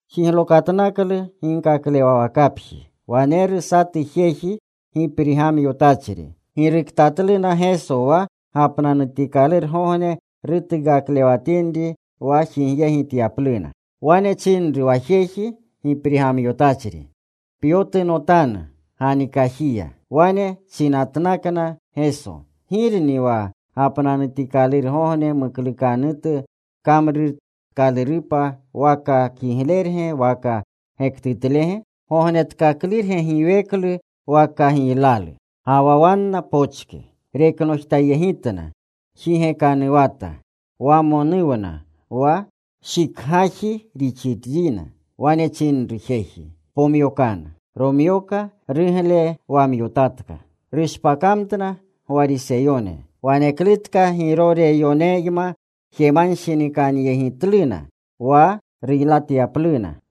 Jiglokatnaklu ginkaklewawakapji. Waneru satu jeji giprigamyotachri. Giruktatluna Geso wa gapnanutikalurgogne rutuukaklewatinri wa jigyegityapluna. Wane chinru wa jeji giprigamyotachri, “Pyotunotanu ganikajiya.” Wane chinatnakna Geso, “¿Girni wa gapnanutikalurgogne muklukanutu kamrutkalurupa: waka kiglerge waka gektutlege? ¿Gognetkaklurge giweklu waka giylalu?” Ga wa wanna pochke. Reknojtayegitna. Jigekanuwata. Wamonuwna wa shikgaji rixinrina. Wane chinru jeji, “Pomyokanu.” Romyoka. Ruglewamyotatka. Rushpakamtna Gwariseyone. Waneklutka Giroreyoneyma jemanshinikankakyegitluna Wale ruylatyapluna.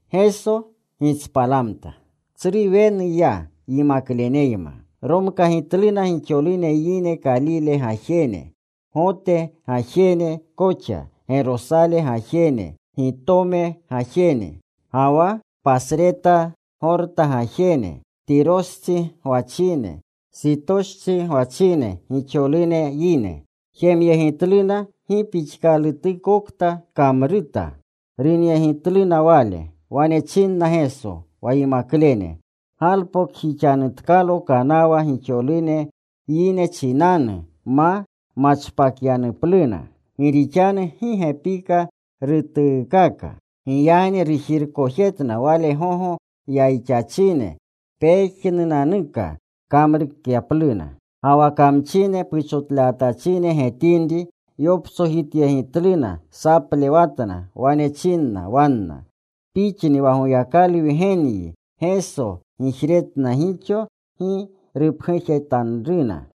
Geso gitspalamta. Tsru wenu ya yimakleneyma. Romkagimtluna gixolune yine Kalile gajene Gote gajene koxa, Gerosale gajene, Gitome gajene, ga wa pasreta Gorta gajene, Tirostsi gwachine, Sitostsi gwachine, gixolune yine. Jemyegitluna gi pixkalutukokta kamruta. Runyegitluna Wale. Wane chinna Geso wa yimaklene galpokjixanutkalo kanawa gixolune yine chinanu ma machpakyanupluna. Gi rixanu gi gepika rutuukaka. Giyagni rujirkojetna Wale gogo yayixachine pejnunanuka kamrukyapluna. Ga wa kamchine puchotlewatachine getinri yoptsojityegitluna. Saplewatna. Wane chinna wanna, “Pixni wa Goyakalu Wgenyi.” Geso gijretna gixo gi rupgujetanruna.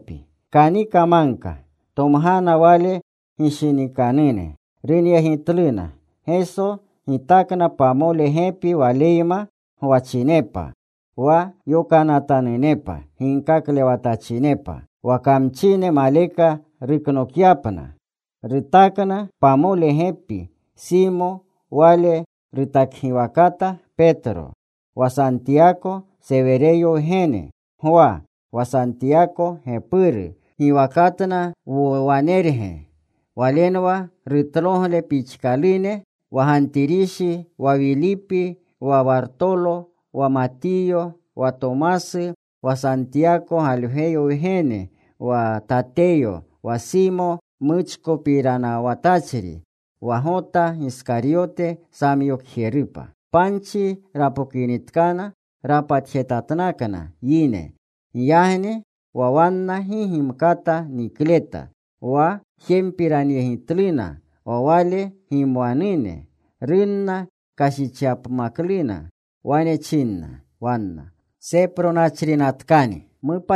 Kanika magka. Tomgana Wale gishinikanune. Runyegitluna. Geso gitakna pamole gepi Waleyma gwachinepa, wa yokanatanunepa ginkaklewatachinepa, wa kamchine maleka ruknokyapna. Rutakna pamole gepi: Simo; wale rutakgiwakata Petro; wa Santiyako, Sewereyo wgene; Gwa, wa Santiyako gepuru (Giwakatna Wowanerge; walenwa rutlogle pixkalune), wa Gantirishi, wa Wilipi, wa Wartolo, wa Matiyo, wa Tomasu, wa Santiyako Galgweyo wgene, wa Tateyo, wa Simo Muchkopiranawatachri; wa Gota Giskaryote samyokjerupa. Panchi rapokinitkana, rapatjetatnakna yine. Giyagni wa wanna gi gimkata nikletna. Wa jempiranyegitluna wa Wale gimwanune. Runna kashichyapmakluna. Wane chinna wanna, “Sepronachrinatkani.”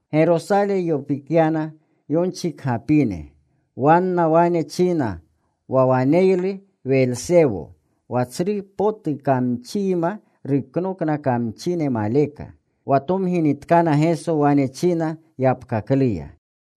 Gerosale yopikyana yonchikgapine. Wanna wane china wa waneylu Welsewo, wa tsru potu kamchiyma ruknokna kamchine maleka. Wa tomginitkana Geso, wane china yapkakluya,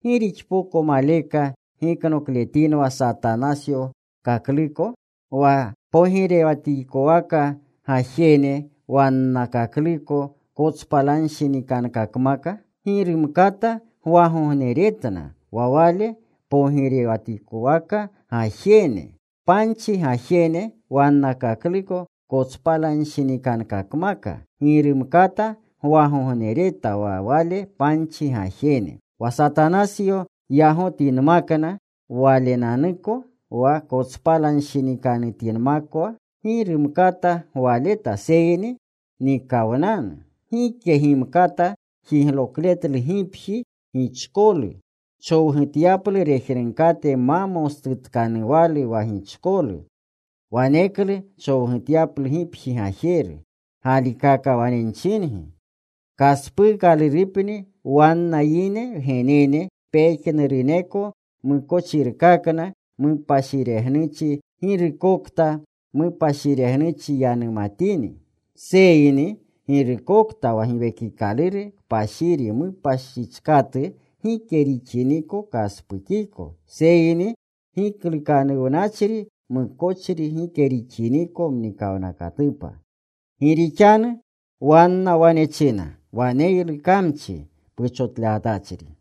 “¿Gi rixpoko maleka giknokletinwa Satanasyokakluko? Wa pogirewatikowaka gajene wannakakluko kotspalanshinikankakmaka, gi rumkata gwagogneretna wa wale pogirewatikowaka gajene. Panchi gajene wannakakluko kotspalanshinikankakmaka gi rumkata gwagognereta wa wale panchi gajene. Wa Satanasyo yagotinmakwa walenanuko wa, kotspalanshinikanutinmakwa gi rumkata gwaleta seyni nikawnanu. Gike gimkata jiglokletlu gipji gichkolu, chowgutyaplu rejnunkate ma mostutkanuwalu wa gichkolu. Waneklu chowgutyalu gipji gajeru. Galikaka wane nchingi, kaspuukalurupni wanna yine wgenene pejnuruneko mukochirkakna, mupashiregnuchi girukokta mupashiregnuchi yanumatini. Seyni girukokta wa Giwekikaluru Kpashiri mupashichkatu, gike rixiniko kaspukiko seyni giklukanuwnachri mukochri gike rixiniko mnikawnakatupa.” Gi rixanu wanna wane china, “Waneylu kamchi puchotlewatachri.”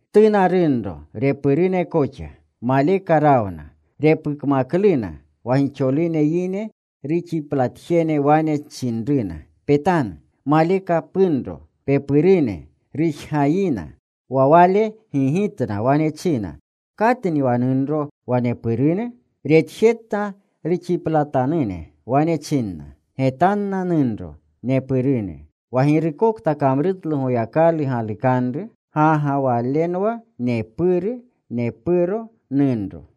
Tuna runro, repurune koxa. Maleka rawna. Repukmakluna. Wa gixolune yine ruxiplatjene wane chinruna, “Petanu. Malekna punro, pepurune. Rujgayina.” Wa Wale gigitna. Wane china, “¿Katni wa nunro, wa nepurune?” Retjetna ruxiplatanune. Wane china, “Getanna nunro nepurune. Wa girukokta kamrutlu Goyakalu galukanru, ga ga walenwa nepuru, nepuro, nunro.”